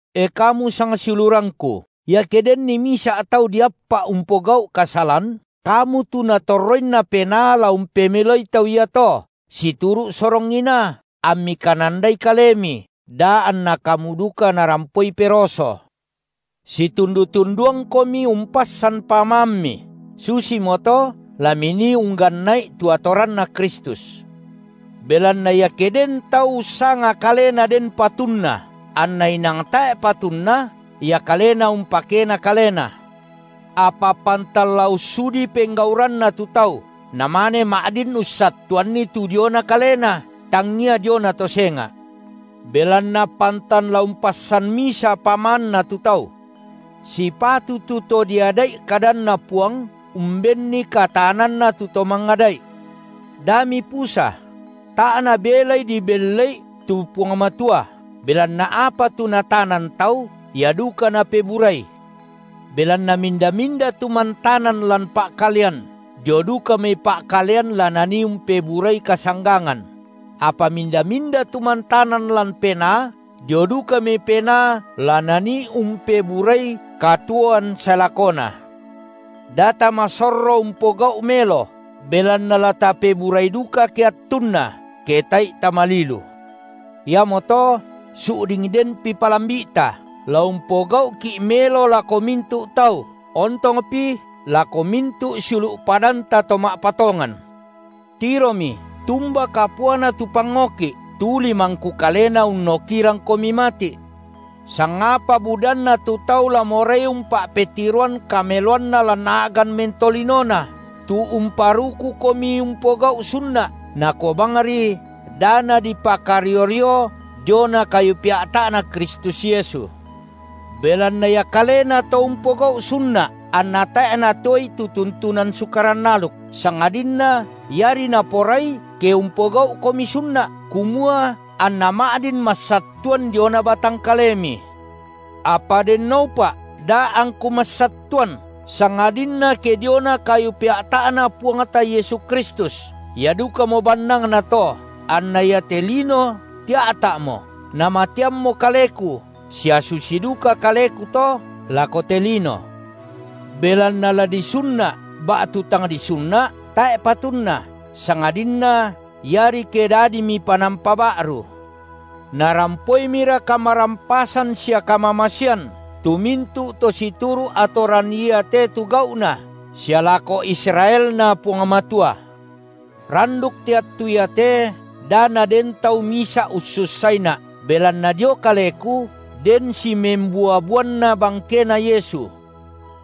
E kamu sangsiulurangku, iake denni misa’ tau diappa’ umpogau’ kasalan, kamu tu Natorroinna Penaa la umpemeloi tau iato situru’ sorong inaa, ammi kanandai kalemi, da anna kamu duka narampoi peroso. Situndu-tunduangkomi umpassan pamaammi, susimoto la minii ungganna’i tu atoranNa Kristus. Belanna iake den tau ussanga kalena den patunna, anna inang tae’ patunna, ia kalena umpakena kalena. Apa pantan la ussudi penggauranna tu tau, namane ma’din ussattuanni tu diona kalena, tangia diona to senga’. Belanna pantan la umpassan misa pamaanna tu tau. Sipatu tu to diada’i kadanNa Puang umbenni kataananna tu to mangada’i. Da mipusa: tae’ nabelai dibelle’i tu Puang Matua, belanna apa tu natanan tau, ia duka napeburai. Belanna minda-minda tu mantanan lan pa’kalean, dio duka mai pa’kalean la nanii umpeburai kasanggangan; apa minda-minda tu mantanan lan Penaa, dio duka mai Penaa la nanii umpeburai katuoan sae lakona. Da tamasorro umpogau’ melo, belanna la tapeburai duka ke attunna ke tae’i tamalilu. Iamoto su’ding denpi palambi’ta, la umpogau’ki’ melo lako mintu’ tau, ontongpi lako mintu’ siulu’ padanta to ma’patongan. Tiromi tumba kapuana tu pangoki’, tu limangku kalena unnokirangkomi mati’. Sangapa budanna tu tau la morai umpa’petiroan kameloanna lan a’gan mentolinona, tu umparukukomi umpogau’ sunna’, nakua bangri da nadipakario-rio diona kayu pea’ta’Na Kristus (Yesu). Belanna ia kalena to umpogau’ sunna’, anna tae’ natoei tu tuntunan Sukaran aluk, sangadinna iari naporai ke umpogau’komi sunna’, kumua anna ma’din massattuan diona batang kalemi. Apa dennoupa’ da’ angku massattuan, sangadinna ke diona kayu pea’ta’Na Puangta Yesu Kristus, ia dukamo bannangnato, anna iate lino tia’ta’mo, namateammo kaleku sia susi duka kaleku to lako te lino. Belanna la disunna’ ba’tu tang disunna’, tae’ patunna, sangadinna iari ke dadimi panampa ba’ru. Narampoimira kamarampasan sia kamamasean tu mintu’ to situru’ atoran iate tu gau’na sia lako IsraelNa Puang Matua. Randuk te attu iate da naden tau misa’ ussussaina’, belanna dio kaleku den simembua-buanna bangkeNa Yesu.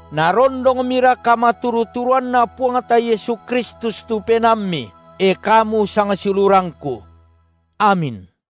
Narondongmira kamaturu-turuanNa Puangta Yesu Kristus tu penaammi, e, kamu sangsiulurangku. Amin.